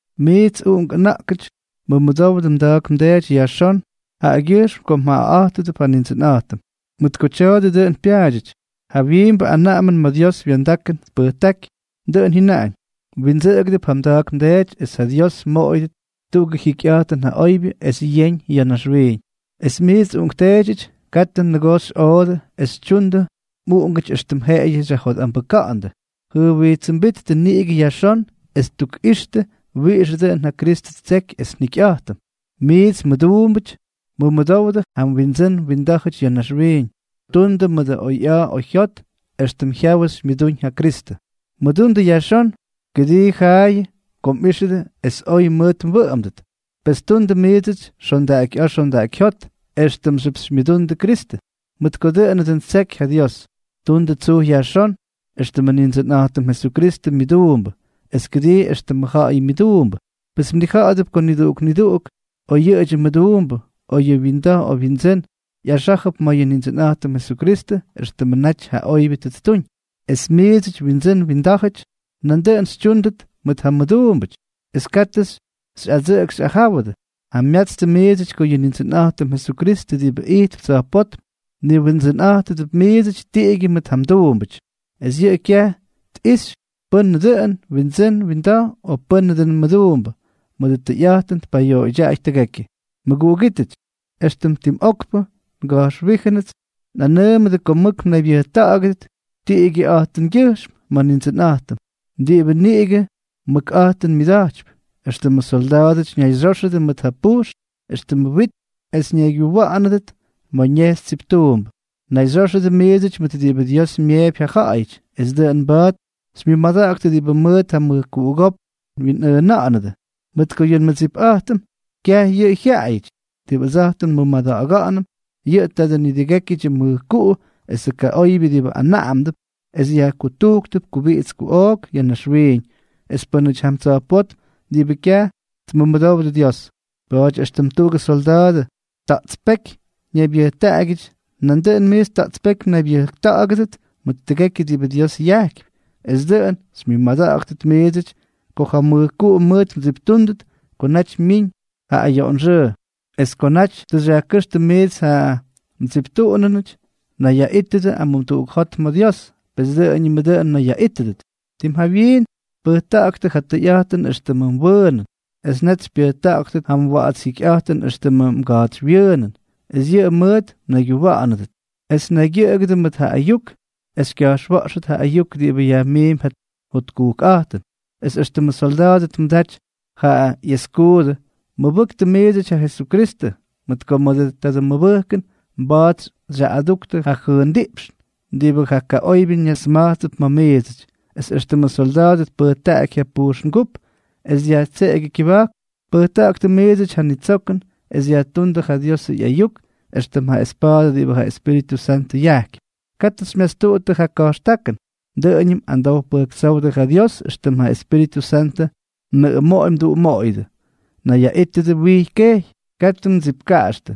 Miits uꞌunk ʉna̱ꞌkʉty, mʉmʉdowdʉ mda̱a̱k mdeety yajxón jaꞌagyʉjxm ko mjaꞌaꞌa̱jtʉdʉp ja Nindsʉnꞌa̱jtʉm, mʉt ko tya̱a̱dʉ dʉꞌʉn pyaadyʉty. Ja jawyiimbʉ anaꞌamʉn ma̱ Dios wa̱ndakʉn tpʉjtáky, dʉꞌʉn jyʉnaꞌañ: “Mwindsʉꞌʉgʉp ja mda̱a̱k mdeety es ja Dios mmoꞌoyʉdʉt tuꞌugʉ jikyꞌa̱jtʉn ja oybyʉ es yeñ ya̱ naxwiiñ.” Es miits uꞌunkteedyʉty, katʉ nʉgoo xyꞌoodʉ es xytyundʉ mꞌuꞌungʉty éxtʉm jeꞌeyʉ xyajjotꞌambʉka̱ꞌa̱ndʉ, jʉjwijtsʉmbíttʉ niꞌigʉ yajxón es tukꞌixtʉ wiꞌixʉ dʉꞌʉn ja Kristʉ ttseky es njikyꞌa̱jtʉm. Miits mmʉduumbʉty, mʉmʉdówdʉp ja mwindsʉ́n mwindá̱jʉty ya̱ naxwiiñ. Tundʉ mʉdʉ oyꞌa̱a̱ oyjyot, éxtʉm jyawʉ xymyʉdúñ ja Kristʉ. Mʉdundʉ yajxón, kʉdii jaayʉ ko mꞌíxʉdʉ es oy mʉt mwʉꞌʉmdʉt. Pes tundʉ miidsʉty xondaꞌakyꞌa̱a̱ xondaꞌakyjyót éxtʉmxyʉp xymyʉdundʉ Kristʉ, mʉt ko dʉꞌʉnʉ dʉn ttseky ja Dios. Tundʉ tsuj yajxón, éxtʉmʉ Nindsʉnꞌa̱jtʉm Jesukristʉ myʉduumbʉ, es kʉdii extʉmʉ ja̱ꞌa̱yʉ myʉduumbʉ. Pes mnija̱ꞌa̱dʉp ko niduꞌuk niduꞌuk, oyyʉꞌʉdyʉ mʉduumbʉ, o yʉ winda̱j o windsʉ́n, ꞌyaxá̱jʉp ma̱ yʉ Nindsʉnꞌa̱jtʉm Jesukristʉ éxtʉmʉ naty ja oybyʉ tʉ ttuñ. Es miidsʉty windsʉ́n windá̱jʉty, nandʉꞌʉn xytyúndʉt mʉt ja mduumbʉty, es katʉ xyꞌadsʉꞌʉk xyꞌajáwʉdʉ. Jamyatstʉ miidsʉty ko yʉ Nindsʉnꞌa̱jtʉm Jesukristʉ diꞌibʉ ijtp tsa̱jpótm, mniWindsʉnꞌa̱jtʉdʉp miidsʉty tiꞌigyʉ mʉt ja mduumbʉty, es yʉꞌʉ kyaj tꞌixy pʉ́nʉ dʉꞌʉn windsʉ́n winda̱j o pʉ́nʉ dʉꞌʉn mʉduumbʉ, mʉdʉ tʉyꞌa̱jtʉn tpayoꞌoydyaꞌay tʉgekyʉ. Mʉguꞌugítʉty, éxtʉm tim okpʉ nga̱jxwíjʉnʉts nꞌanʉʉmʉdʉ ko mʉk mnaybyʉjta̱ꞌa̱gʉdʉt tiꞌigyʉꞌa̱jtʉngyʉjxm ma̱ Nindsʉnꞌa̱jtʉm, diꞌibʉ niꞌigʉ mʉkꞌa̱jtʉn myʉda̱jtypy. Extʉmʉ solda̱a̱dʉty ñayxyóxʉdʉ mʉt ja pujxn éxtʉmʉ wit es ñaygyuwa̱ꞌa̱nʉdʉt ma̱ ñejxy tsiptuumbʉ, nayxyóxʉdʉ miidsʉty mʉt diꞌibʉ Dios myeepy ja jyaꞌayʉty, es dʉꞌʉn mba̱a̱t xymyʉmada̱ꞌa̱ktʉ diꞌibʉ mʉt ja mʉjkuꞌugópk mwinꞌʉꞌʉna̱ꞌa̱nʉdʉ. Mʉt ko yʉ nmʉdsipꞌa̱jtʉm, kyaj yʉꞌʉ jyaꞌayʉty. Diꞌibʉ ʉdsa̱jtʉm nmʉmada̱ꞌa̱ga̱ꞌa̱nʉm, yʉꞌʉ taadʉ nidʉgékyʉdyʉ mʉjkuꞌu esʉ kaꞌoybyʉ diꞌibʉ anaꞌamdʉp es yajkutujktʉp kubiꞌits kuꞌook ya̱ naxwiiñ es pʉ́nʉty jam tsa̱jpótm diꞌibʉ kyaj tmʉmʉdowdʉ Dios. Pa̱a̱ty, éxtʉm tuꞌugʉ solda̱a̱dʉ ta̱ꞌtspéky ñaybyʉjtaꞌagyʉty, nandʉꞌʉn miits ta̱ꞌtspéky mnaybyʉjta̱ꞌa̱gʉdʉt mʉt tʉgekyʉ diꞌibʉ Dios yajkypy, es dʉꞌʉn xymyʉmada̱ꞌa̱ktʉt miidsʉty ko ja mʉjkuꞌu mʉʉt mdsiptúndʉt ko naty myiñ ja ayoꞌonxʉʉ. Es ko naty tʉ xyajkʉ́xtʉ miits ja mdsiptuꞌunʉnʉty, nayyaꞌítʉdʉ amumduꞌuk jot ma̱ Dios. Pes dʉꞌʉñʉm dʉꞌʉn mnayyaꞌítʉdʉt. Tim jawyiin, pʉjta̱ꞌa̱ktʉ ja tʉyꞌa̱jtʉn éxtʉmʉ mwʉʉnʉn, es net xypyʉjta̱ꞌa̱ktʉt ja mwa̱ꞌa̱ts jikyꞌa̱jtʉn éxtʉmʉ mga̱a̱tsywyʉʉnʉn, es yʉꞌʉ mʉʉt mnayguwa̱ꞌa̱nʉdʉt; es naygyʉꞌʉgʉdʉ mʉt ja ayuk esʉ xykya̱jxwa̱ꞌxtʉt ja ayuk diꞌibʉ yajmiimp ja jotkujkꞌa̱jtʉn, es éxtʉmʉ solda̱a̱dʉ tmʉdaty ja ꞌyeskuudʉ, mʉbʉktʉ miidsʉty ja Jesukristʉ, mʉt ko mʉdʉ tadʉ mʉbʉjkʉn mba̱a̱t xyaꞌꞌaduktʉ ja jʉʉndiꞌpxn diꞌibʉ ja kaꞌoybyʉ ñasma̱jtsʉp ma̱ miidsʉty. Es éxtʉmʉ solda̱a̱dʉ tpʉjtaꞌaky ja pyujxngúp es dyajtseꞌegyʉ kyʉba̱jk, pʉjta̱ꞌa̱ktʉ miidsʉty ja nitsokʉn, es yajtúndʉ ja Diosʉ ꞌyayuk éxtʉm ja espa̱a̱dʉ diꞌibʉ ja Espíritʉ Santʉ yajkypy. Katʉ xymyastuꞌuttʉ ja ka̱jxtákʉn; dʉꞌʉñʉm amdow pʉjktsówdʉ ja Dios éxtʉm ja Espíritʉ Santʉ mnʉꞌʉmoꞌoy mduꞌumoꞌoyʉdʉ. Nayyaꞌítʉdʉ wijy kejy, katʉ mmʉdsipkaꞌaxtʉ,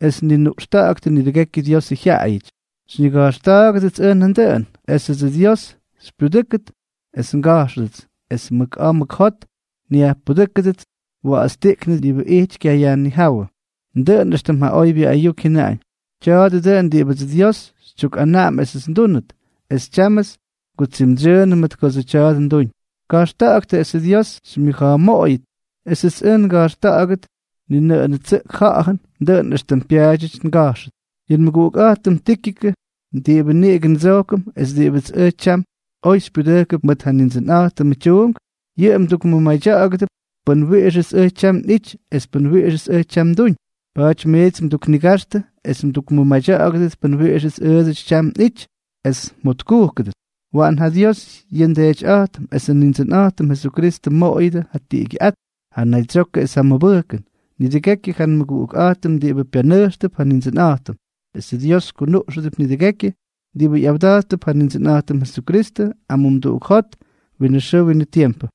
es ninuꞌxta̱ꞌa̱ktʉ nidʉgekyʉ Diosʉ jyaꞌayʉty. Xyñiga̱jxta̱a̱gʉdʉts ʉj nandʉꞌʉn, esʉdsʉ Dios xypyudʉ́kʉt es nga̱jxʉdʉts, es mʉk a̱a̱ mʉk jot nyaꞌʉxpʉ́kʉdʉts wa̱ꞌa̱tstiꞌknʉ diꞌibʉ ijty kyayajnijáwʉ, dʉꞌʉn éxtʉm ja oybyʉ ayuk jyʉnaꞌañ. Tya̱a̱dʉ dʉꞌʉn diꞌibʉdsʉ Dios xytyukꞌanaꞌam esʉts ndúnʉt, es tyámʉts ngutsimdsyʉʉnʉ mʉt kodsʉ tya̱a̱dʉ nduñ. Ka̱jxta̱ꞌa̱ktʉ esʉ Diósʉts xymyʉja̱a̱moꞌoyʉt esʉts ʉj nga̱jxtuda̱ꞌa̱gʉdʉt ni nʉꞌʉn tsʉꞌk ja̱ꞌa̱jʉn, dʉꞌʉn éxtʉm pyaadyʉty nga̱jxʉt. Yʉ nmʉguꞌukꞌa̱jtʉm Tíkikʉ, diꞌibʉ niꞌigʉ ndsojkʉm es diꞌibʉts ʉj tyam oy xypyudʉjkʉp mʉt ja Nindsʉnꞌa̱jtʉmʉ tyuunk, yʉꞌʉ mdukmʉmadya̱ꞌa̱gʉdʉp pʉn wiꞌixʉts ʉj tyam nꞌity es pʉn wiꞌixʉts ʉj tyam nduñ. Pa̱a̱ty miits nduknigaxtʉ es mdukmʉmadya̱ꞌa̱gʉdʉt pʉn wiꞌixʉts ʉʉdsʉty tyam nꞌity, es mjotkujkʉdʉt. Waꞌan ja Dios, yʉ nDeetyꞌa̱jtʉm, esʉ Nindsʉnꞌa̱jtʉm Jesukristʉ, tmoꞌoyʉdʉ ja tiꞌigyʉꞌát, ja naydsyokʉ es ja mʉbʉjkʉn, nidʉgekyʉ ja nmʉguꞌukꞌa̱jtʉm diꞌibʉ pyanʉjxtʉp ja Nindsʉnꞌa̱jtʉm, esʉ Dios kunuꞌxʉdʉp nidʉgekyʉ diꞌibʉ ꞌyawda̱jttʉp ja Nindsʉnꞌa̱jtʉm Jesukristʉ amumduꞌuk jot winʉ xʉʉ winʉ tiempʉ.